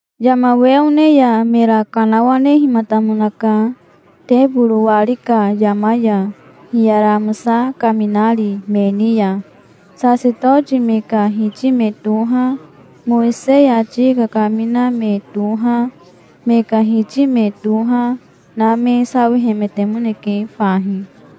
Yama we one ya mera kanawanehimatamonaka teboro wari ka yama ya, hiyara amosa kaminari me ni ya. Sasetoti me ka hiti me toha, Mowisei ati kakamina me toha, me ka hiti me toha na me sawihemetemoneke fahi.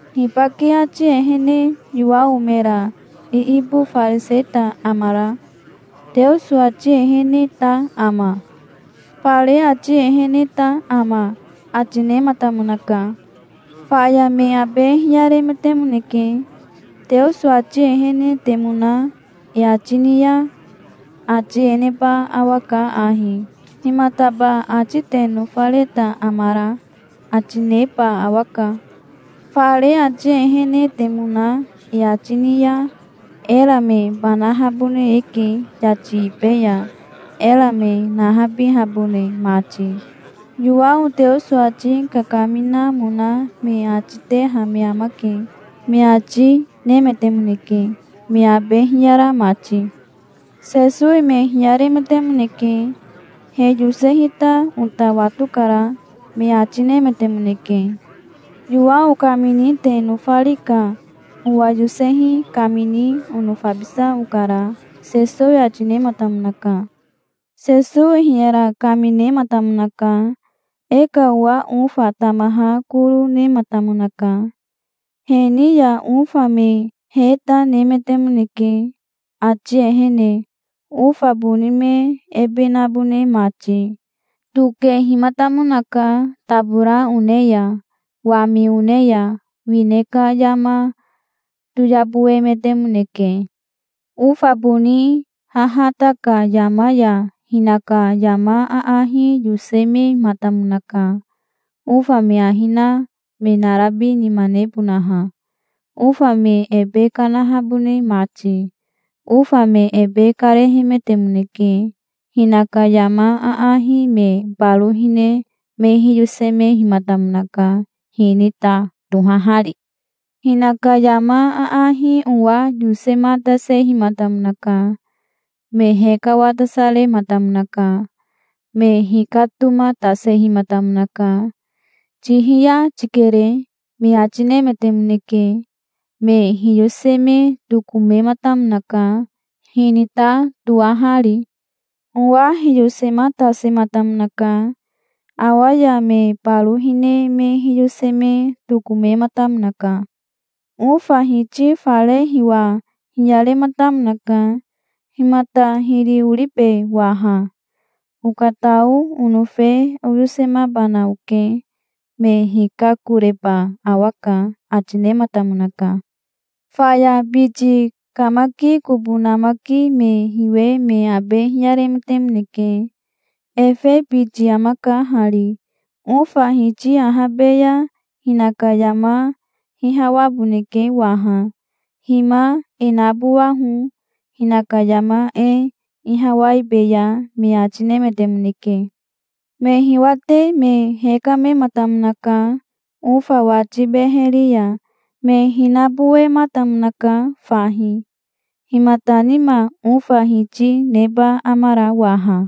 Hibake ati ehene Yowao mera iibofariseta amara? Teoso ati eheneta ama? Fare ati eheneta ama?" ati nematamonaka. Faya me abe hiyaremetemoneke. "Teoso ati ehenetemona e ati ni ya ati e neba awaka ahi: 'Himataba ati te nofareta amara?' ati neba awaka. Fare ati ehenetemona e ati ni ya era me banahabone eke yati ibe ya, era me nahabihabone mati. Yowao Teoso ati kakaminamona me ati teha me amake", me ati nemetemoneke, me abe hiyara mati. Sesowi me hiyaremetemoneke. "He yosehita ota watokara", me ati nemetemoneke. "Yowao kamini te nofari ka owa yosehi kamini onofabisa okara", Sesowi ati nematamonaka. Sesowi hiyara kaminematamonaka. "E ka owa ofa tamaha koro nematamonaka. He ni ya ofa me heta nemetemoneke ati ehene, ofa boni me ebe nabone mati. Tokehimatamonaka tabora one ya, wami one ya. Wine ka yama toyaboemetemoneke". "Ofa boni hahata ka yama ya hinaka yama aahi yosemematamonaka ofa me ahi na me narabi nima nebonaha, ofa me ebe kanahabone mati. Ofa me ebe karehemetemoneke. Hinaka yama aahi me baro hine me hiyosemehimatamonaka, hinita tohahari". "Hinaka yama aahi owa yosematasehimatamonaka. Me hekawatasarematamonaka. Me hikatomatasehimatamonaka. 'Tihiya tikere', me ati nemetemoneke. Me hiyoseme tokomematamonaka, hinita toahari". "Owa hiyosematasematamonaka. Awa ya me baro hine me hiyoseme tokomematamonaka". "Ofa hiti fare hiwa hiyarematamonaka. 'Himata hiri oribe waha? Okatao onofe oyosemabana oke. Me hikakoreba awaka', ati nematamonaka". "Faya biti kamaki kobo namaki me hiwe me abe hiyaremetemoneke. 'Efe biti amaka hari. Ofa hiti ahabe ya hinaka yama hihawaboneke waha. Hima e nabowaho. Hinaka yama e ihawaibeya', me ati nemetemoneke. Me hiwate me hekamematamonaka ofa wati beheri ya. Me hinabowematamonaka fahi". "Himata nima ofa hiti neba amara waha?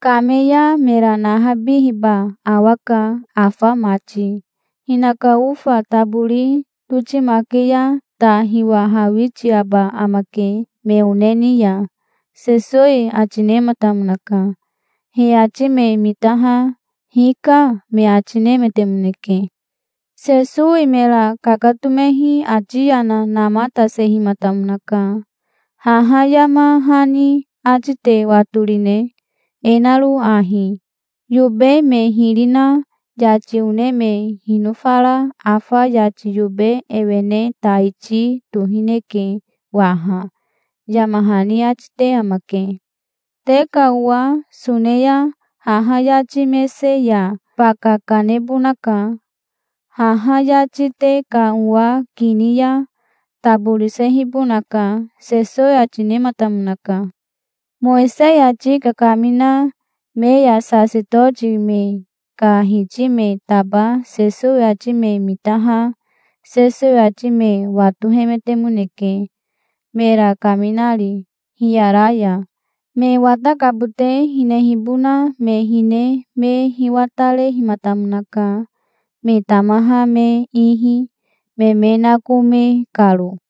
Kame ya mera nahabihiba awaka afa mati. Hinaka ofa tabori totimake ya ta hiwahawitiaba amake me one ni ya", Sesowi ati nematamonaka. He ati me mitaha "Hika", me ati nemetemoneke. Sesowi mera kakatomehi ati yana namatasehimatamonaka. "Haha yama hani ati te watorine, e naro ahi: 'Yobe me hiri na yati one me hinofara afa yati yobe ewene taiti tohineke waha', yama hani ati te amake. Te ka owa sone ya haha yati mese ya baka kanebonaka. Haha yati te ka owa kini ya taborisehibonaka", Sesowi ati nematamonaka. Mowisei ati kakamina me ya sasetoti me ka hiti me taba Sesowi ati me mitaha Sesowi ati me watohemetemoneke, mera kaminari, hiyara ya. Me watakabote hinehibona me hine me hiwatarehimatamonaka, me tamaha me ihi, me me nakome karo.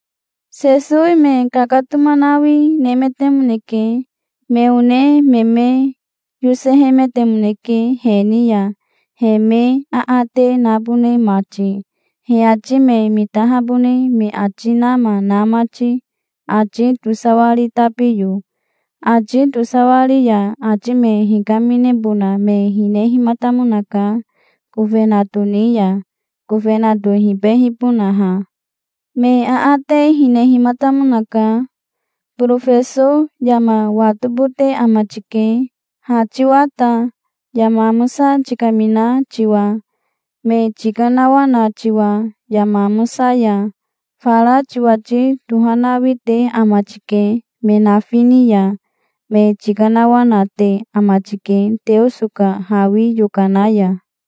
Sesowi me kakatomanawi nemetemoneke. Me one me me yosehemetemoneke he ni ya, he me aate nabone mati, he ati me mitahabone me ati nama na mati, ati tosawari tabiyo. Ati tosawari ya ati me hikaminebona me hinehimatamonaka kofenato ni ya, kofenato hibehibonaha. Me aate hinehimatamonaka. "Borofeso yama watobote ama tike, ha tiwa ta, yama amosa tikamina tiwa, me tikanawana tiwa, yama amosa ya. Fara tiwati tohanawi te ama tike me nafi ni ya. Me tikanawanate ama tike Teoso ka hawi yokana ya.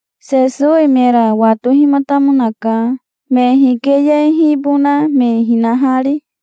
Sesowi mera watohimatamonaka, me hikeyehibona me hinahari.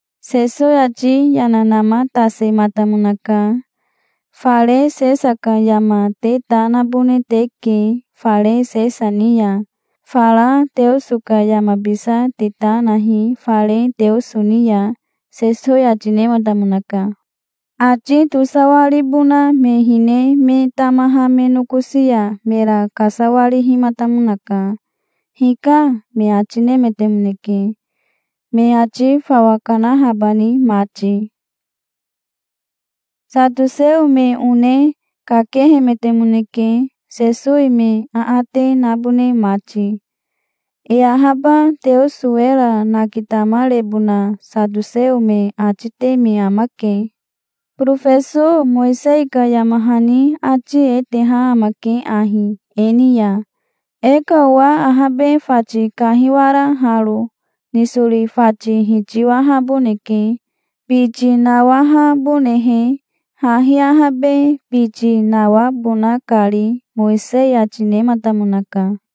Sesowi ati yana namatasematamonaka. "Fare Sesa ka yama te ta nabone teke fare Sesa ni ya. Fara Teoso ka yamabisa te ta nahi fare Teoso ni ya", Sesowi ati nematamonaka. Ati tosawaribona me hine me tamaha me nokosi ya mera kasawarihimatamonaka. "Hika", me ati nemetemoneke, me ati fawa kanahabani mati. Satoseo me one kakehemetemoneke Sesowi me aate nabone mati. E ahaba Teoso era nakitamarebona satoseo me ati te me amake. "Borofeso Mowisei ka yama hani ati e teha amake ahi e ni ya: E ka owa ahabe fati kahiwara haro nisori fati hitiwahaboneke, biti nawahabonehe, hahi ahabe biti nawabona kari, Mowisei ati nematamonaka.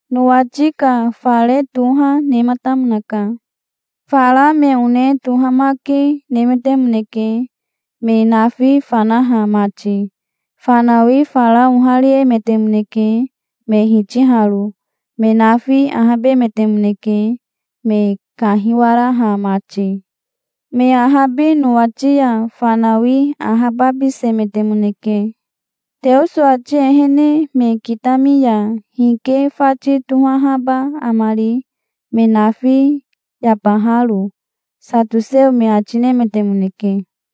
Nowati ka fare toha nematamonaka. Fara me one tohamake nemetemoneke, me nafi fanaha mati. Fanawi fara ohariemetemoneke, me hitiharo. Me nafi ahabemetemoneke, me kahiwaraha mati. Me ahabi nowati ya fanawi ahababisemetemoneke. Teoso ati ehene me kitami ya hike fati tohahaba amari, me nafi yabaharo?", satoseo me ati nemetemoneke.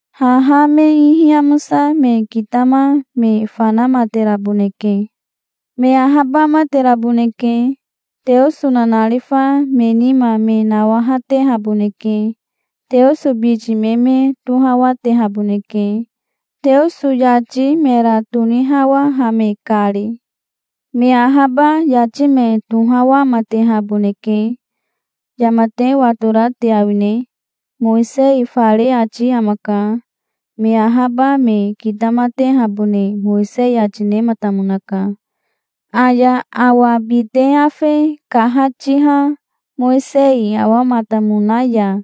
Haha me ihi amosa me kitama me fanamateraboneke. Me ahabamateraboneke. Teoso nanarifa me nima me nawahatehaboneke. Teoso biti me me tohawatehaboneke, Teoso yati mera tonihawahame kari. Me ahaba yati me tohawamatehaboneke". "Yama te watora te awine? Mowisei fare ati amaka. Me ahaba me kitamatehabone Mowisei ati nematamonaka. Aya awa bite afe kahatiha Mowisei awamatamona ya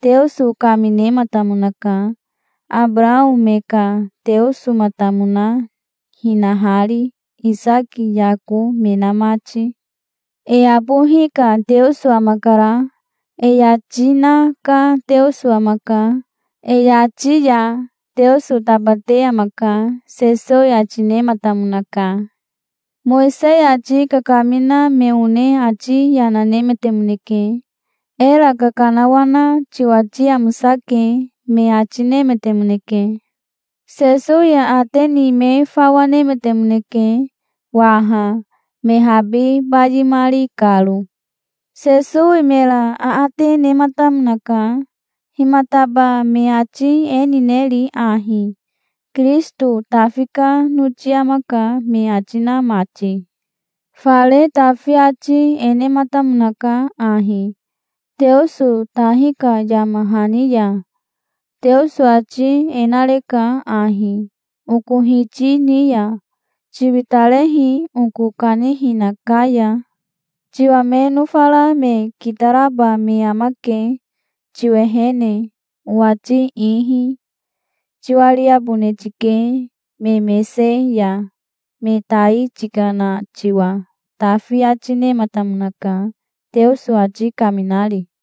Teoso kaminematamonaka, Abarao me ka Teosomatamona hinahari, Isaki Yako me na mati. E abohi ka Teoso amakara. E yati na ka Teoso amaka. E yati ya Teoso tabate amaka", Sesowi ati nematamonaka. Mowisei ati kakamina me one ati yana nemetemoneke. "Era kakanawana tiwati amosake", me ati nemetemoneke. Sesowi aate ni me fawa nemetemoneke waha, me habi bayimari karo. Sesowi mera aate nematamonaka. "Himataba me ati e nineri ahi, 'Kirisito Tafi ka noti amaka', me ati na mati? Fare Tafi ati e nematamonaka ahi, Teoso tahi ka yama hani ya: 'Teoso ati e nareka ahi, oko Hiti ni ya: "Tiwitarehi oko kanihina ka ya. Tiwa me nofara me kitaraba me amake tiwehene, owati ihi. Tiwariabone tike me mese ya, me tai tikana tiwa"', Tafi ati nematamonaka, Teoso ati kaminari.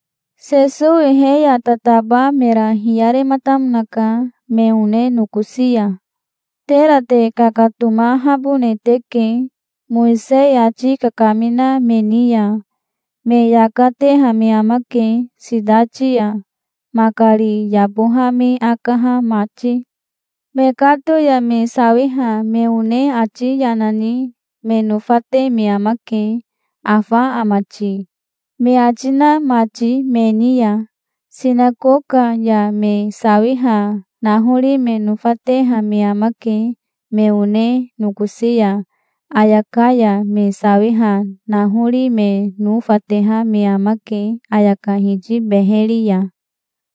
Sesowi he ya tataba mera hiyarematamonaka me one nokosi ya. "Tera te kakatomahabone teke, Mowisei ati kakamina me ni ya. Me yaka teha me amake sitati ya, makari yaboha me akaha mati. Mekato ya me sawiha me one ati yana ni me nofate me amake, 'Afa ama ti?' me ati na mati me ni ya. Sinakoka ya me sawiha nahori me nofateha me amake me one nokosi ya. Ayaka ya me sawiha nahori me nofateha me amake ayaka hiti beheri ya.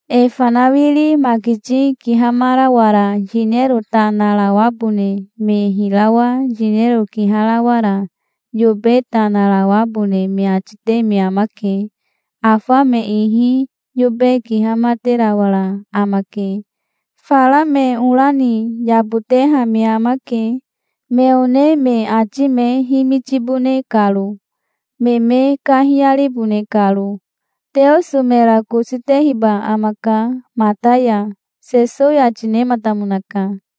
E fanawiri makiti kihamarawara yinero ta narawabone me hirawa yinero kiharawara yobe ta narawabone me ati te me amake. Afa me ihi yobe kihamaterawara amake. Fara me ora ni yaboteha me amake, me one me ati me himitibone karo, me me kahiyaribone karo. Teoso mera kosi tehiba amaka mata ya", Sesowi ati nematamonaka.